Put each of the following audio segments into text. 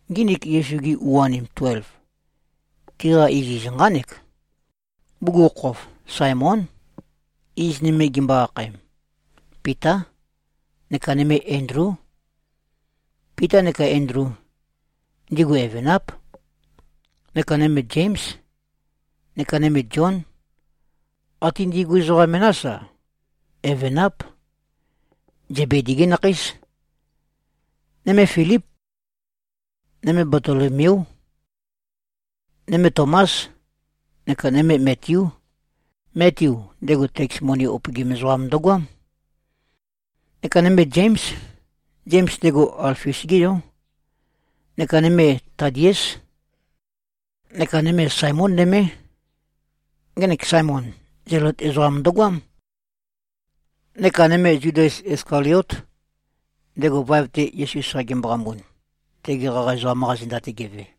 Nginik Yesu-gi u-anim tuelv, tiqa iziz nqánek: Bugukhokhof, Saemón. Iz nøme gimbo-akhaem, Pitá. Neka nøme Endlú. Pita neka Endlu, ndigu evenáp. Neka nøme Zéms, neka nøme Zión. Até ndigu ezoqa menás-a, evenáp. Zebedi-gí nakheís. Nøme Filíp. Nøme Batolomeú. Nøme Tomás. Neka nøme Metiú. Metiu, ndego teks moni upøgim ezoqam ndøgoám. Neka nøme Zéms. Zems, ndego Alfius-gé yó. Neka nøme Tadiés. Neka nøme Saemón nømé. Ngenek Saemon, Zelot ezoqam ndøgoám. Neka nøme Zudas Iskaliót, ndego vaev-te Yesu sa gemboqambun, tegi qaqa ezoqam-qa zenda-te geve.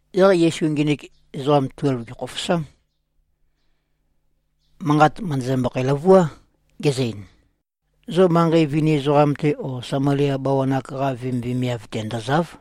Yaq Yesu nginik ezoqa tuelv gèkhofosám. Manqa mø̀ndøzømbøkhæ-løvuá, gezø-ein, “Zo manqei vini ezoqam-te o Samalia bawan-ak-qa vemivemiav-te ndø̀za᷄v.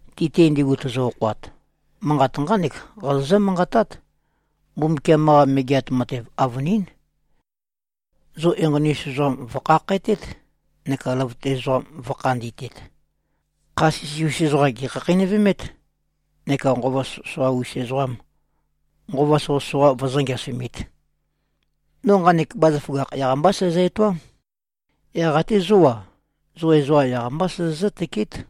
Ti-te ndigu tozo-okhoat, manqat nqánek qazozǿ-manqatát, ‘Mbumbukiam-qa Megeat Matev avønín.’ Zo enqoni-us ezoqam vø̀khakhætét, neka løvøte ezoqam vø̄khandi꞉tet. Kha sisi-us ezoqam gèkhakheinøvemét, neka nqova soqøsoqa-us ezoqam, nqova soqøsoqa vøzø̄-ngeasumit. No nqanek bazaføgakh yaq-mbá sæzø-etoám. Yaq até zó-a, zo ezoqa yaq-mbá sozozǿ-tøkeét.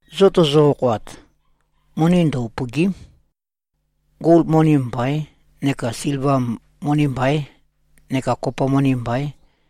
Zo tozo-okhoat, moni ndø-upø̀gi᷄m. Gol moni mbaīn, neka silva moni mbaīn, neka kopa moni mbaīn.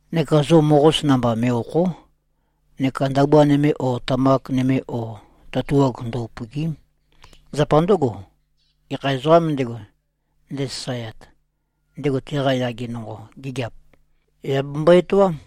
Neka zo moqos namba me꞉-òkho᷄. Neka ndabua nøme o tamak nøme o tatuag ndø-upø̀gi᷄m. Zapa ndǿgo, gekha ezoqām ndego, ndesasaeat, ndego teqa yage nonqo gigiap, yà bembo-etoám.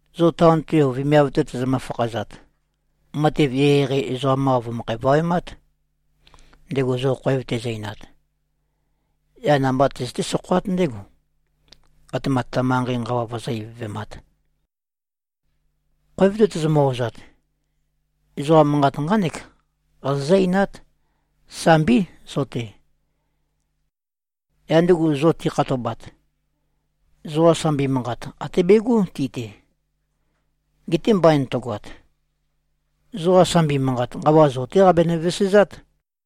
Zo taon-te o vemiav-te tozomø-fakhazat, matev eqeieqei ezoqam-qa vø̀møkho-vawemát, ndego zo khoev tezø-einat. Yaq nambá tøzøté-sokhoát ndégo, atema ta manqei nqawa vozó-ivøvemāt. Khoev-te tozomø-ozat, ezoqa manqat nqánek qazozǿ-einát, ‘Sambí, zo-te.’ Yaq ndigu zo tikhatobat, zoqa sambi manqat até begó ti-te. Geté mbain tøgoat, zoqa sambi manqat nqawa zo-té qabenø-vesezát.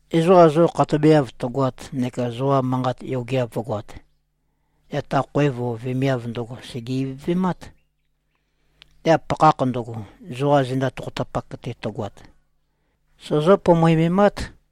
Ezoqa zo khatobeav tøgoat neka zoqa manqat yogeav vǿgoāt, yaq ta khoev o vemiav ndøgo sège-ivøvemát. Yaq pakhakh ndøgo, zoqa zenda tokhotapak-te tøgoat, sozó-pomoememát.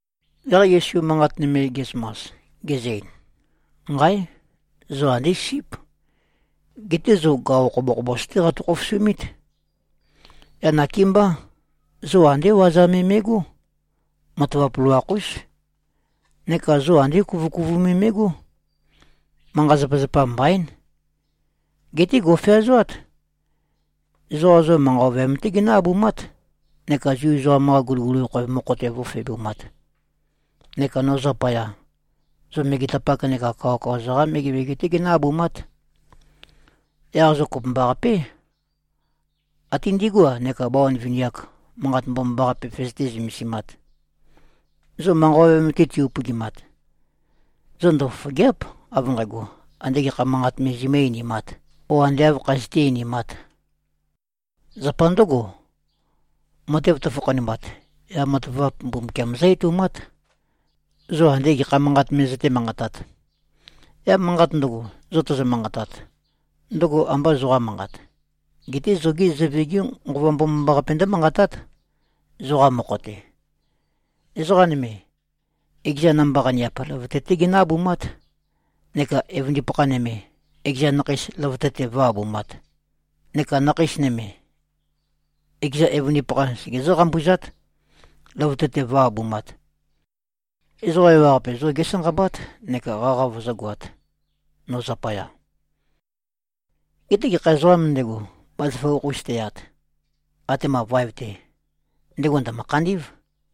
Yaq Yesu manqat nøme ge꞉zømas, gezø-ein, “Nqáe! Zo andé síp. Geté zo gaqo khobokhobos-té qatø-khofosumít. Yaq nakémbá. Zo andé waza me me꞉gó. Matavap loloakh-ús. Neka zo andé kuvøkuvu me me꞉gó. Manqa-zapazapa mbaín. Geté gò꞉feazoát. Ezoqa zo manqa ovøyam-té ginǿ-abumát neka Zu ezoqam-qa guliguli khoev mokho-te vǿfebumāt. Neka no zapaya, zo megetapak neka kawakawa-za-qá megemege-té ginǿ-abumát. Yaq zo kopømbaqapé, até ndigú-a neka bawan vini-ak, Manqat Mbomambaqape vøzøté-zømesimāt. Zo manqa ovøyam-te ti-upøgimat, zo ndøfofògea᷄p, av nqægo, andē gekha manqat me zomǿ-einimāt, o ande āv khazøté-einimāt. Zapa ndǿgo, matev tøfakhanumat, yaq matavap Mbumbukiam zǿ-etoumát, zo andé gekha manqat me zøté-manqatāt. Yaq manqat ndøgo, zo tozo-manqatat, ndøgo ambā zoqa manqat, geté zogé Zøve-gé Nqova Mbomambaqape ndǿmanqatát, zoqa mokho-te. Ezoqa nøme, ekeza namba-qaniap løvøte-té ginǿ-abumát neka evøndipakha nøme, ekeza nakheis løvøte-te vǿ-abumāt. Neka nakheis nøme, ekeza evøndipakha segezǿ-qambuzát, løvøte-te vǿ-abumāt. Ezoqa ewaqape zo gésanqabát neka qaqa vøzǿgoāt, no zapaya. Geté gekha ezoqām ndego, bazaføgakh-us teyat, atema vaev-te, ndego ndø̀mø-khandí꞉v.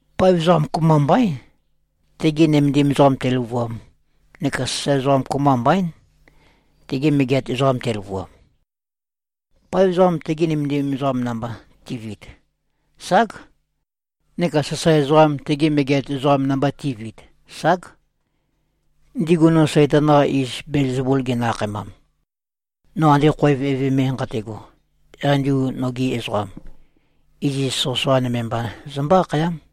Paev ezoqam kopømba mbaín, tege nømendim ezoqam teløvuam, neka sasae ezoqam kopømba mbaín, tege megeat ezoqam teløvuam. Paev ezoqam tege nømendim ezoqam namba ti꞉viit, ság. Neka sasae ezoqam tege megeat ezoqam namba ti꞉viit, ság. Ndigu no Saitan-qa iz Belzebul ginø-akhaemam, no ande khoev eve me nqate꞉go, yaq ndigu nogi ezoqam, iziz soqøsoqa nøme mba zømbó-akhayám.”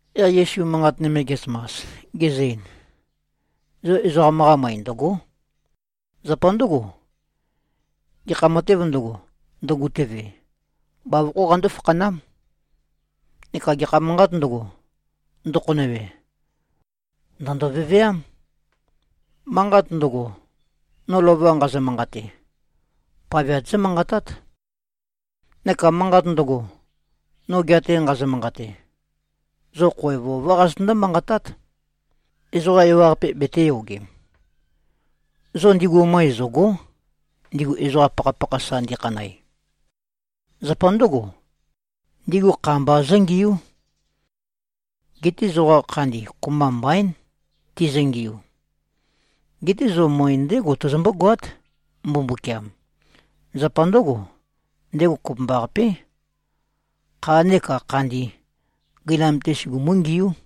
Yaq Yesu manqat nøme ge꞉zømas, gezø-ein, “Zo ezoqam-qa møe ndø̀go᷄. Zapa ndǿgo, gekha matēv ndøgo, ndøgutøve, bavokhó qandó-fakhanám. Neka gekha manqāt ndøgo, ndøkhonøwe, ndø̀ndo-veveám. Manqat ndøgo, no lova nqazø-manqate, paveat zómanqatát. Neka manqat ndøgo, no gea-te nqazø-manqate, zo khoev ová qazøtøndó-manqatát, ezoqa ewaqape betēyogem. Zo ndigu møe zø̀go᷄, ndigu ezoqa pakhapakha sa ndikhanæ. Zapa ndǿgo, ndigu kha mba zǿngiú. Geté zoqa khandi kopømba mbaín, tizøngiu. Geté zo møe ndégo tozombó-goát, Mbumbukiam. Zapa ndǿgo, ndego kopømbaqapé, khā neka khandi, gøinam-te sugumú-ngiú.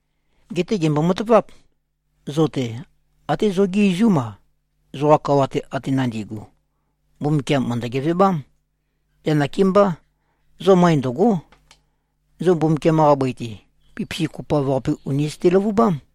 Geté gèmbo-mataváp. Zo-te até zogí izúm-a, zoqa kawa-te ate nandigu, Mbumbukiam mø̀ndø-gevebám. Yaq nakémbá. Zo møe ndø̀go᷄. Zo Mbumbukiam-qa bøi-te, pipisi kopoav-qape ùni zøte-løvubám.”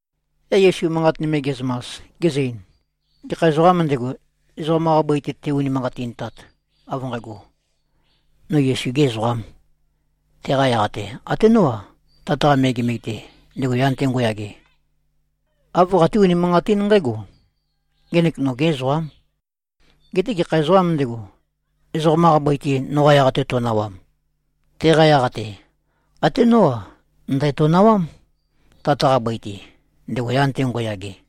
Yaq Yesu manqat nøme ge꞉zømas, gezø-ein, “Gekha ezoqām ndego, ezoqam-qa bøi-te te-unimanqatintat, av nqægo, ‘No Yesu-gē ezoqām,’ teqa yaq-te, até nó-a, Tat-qa megemege-te, ndego yan-te ngo꞉yage, āv qaté-unimanqatín nqǽgo, ‘Ngenek nogē ezoqām.’ Geté gekha ezoqām ndego, ezoqam-qa bøi-te noqa yaq-te to꞉nawam, teqa yaq-te, até nó-a, ndæ̀tonawám, Tat-qa bøi-te, ndego yan-te ngo꞉yage.”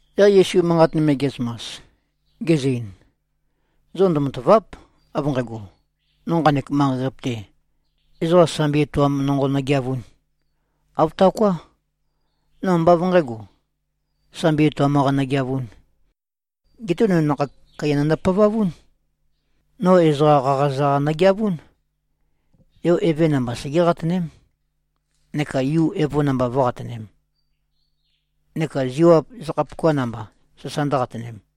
Yaq Yesu manqat nøme ge꞉zømas, gezø-ein, “Zo ndømatàva᷄p, av nqægo, no nqanek manqei-qape-te, ezoqa sambi etoam nonqo nøgeavūn. Āv taoká. No ambá av nqǣgo, sambi etoam-qa nøgeavūn. Geté no nakhag kaiya nøndøpavavún. No ezoqa qaqaza-qa nøgeavún. Yo eve namba segé-qatøném, neka yu evo namba vǿ-qatønēm, neka ziwap zakhapuka namba sasa ndǿqatønēm.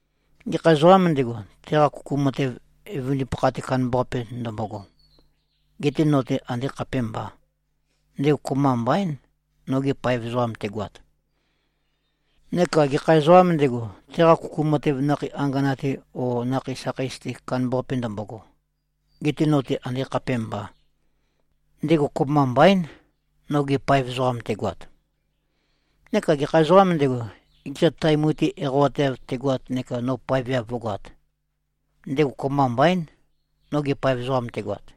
Gekha ezoqām ndego, teqa kuku matev evøndipakha-te, kandambaqape ndømbogo, getē no-te andē khapēmbā, ndego kopømba mbaín, noge paev ezoqam tegoat. Neka gekha ezoqām ndego, teqa kuku matev nakhei angana-te o nakhei sakheis-te, kandambaqape ndømbogo, getē no-te andē khapēmbā, ndego kopømba mbaín, noge paev ezoqam tegoat. Neka gekha ezoqām ndego, ekeza tae mutui eqawateav tegoat neka no paeveav vǿgoāt, ndego kopømba mbaín, noge paev ezoqam tegoat.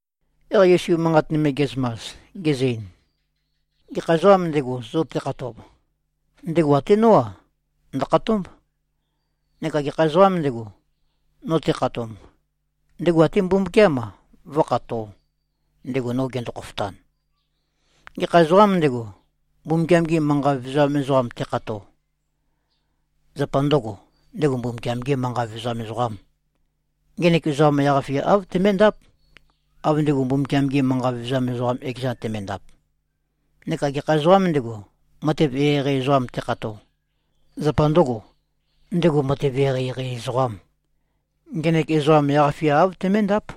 Yaq Yesu manqat nøme ge꞉zømas, gezø-ein, “Gekha ezoqām ndego, zo tekhatob, ndego até nó-a, ndø̀khatómb. Neka gekha ezoqām ndego, no tekhatomb, ndego até Mbumbukiám-a, vǿkhatō, ndego no gendo-khofotan. Gekha ezoqām ndego, Mbumbukiam-ge manqa vevezam ezoqam tekhato, zapa ndøgō, ndego Mbumbukiam-gē manqa vevezam ezoqām, ngenek ezoqam yaq-fia āv teméndáp, av ndego Mbumbukiam-ge manqa vevezam ezoqam ekezan temendap. Neka gekha ezoqām ndego, matev eqeieqei ezoqam tekhato, zapa ndøgō, ndego matev eqeieqei ezoqām, ngenek ezoqam yaq-fia āv teméndáp,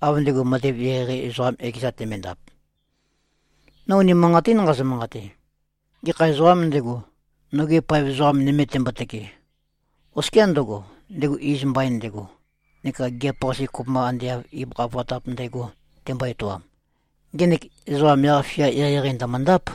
av ndego matev eqeieqei ezoqam ekezan temendap. No unimanqatín nqazø-manqate: Gekha ezoqām ndego, noge paev ezoqa nøme tembotøke, oskiá ndøgo, ndego iz mbain ndego, neka gigiap-qase kopømba ande av ibøkha vatap ndægo tembo-etoam, ngenek ezoqam yaq-fia eqeieqei ndø̀møndáp.”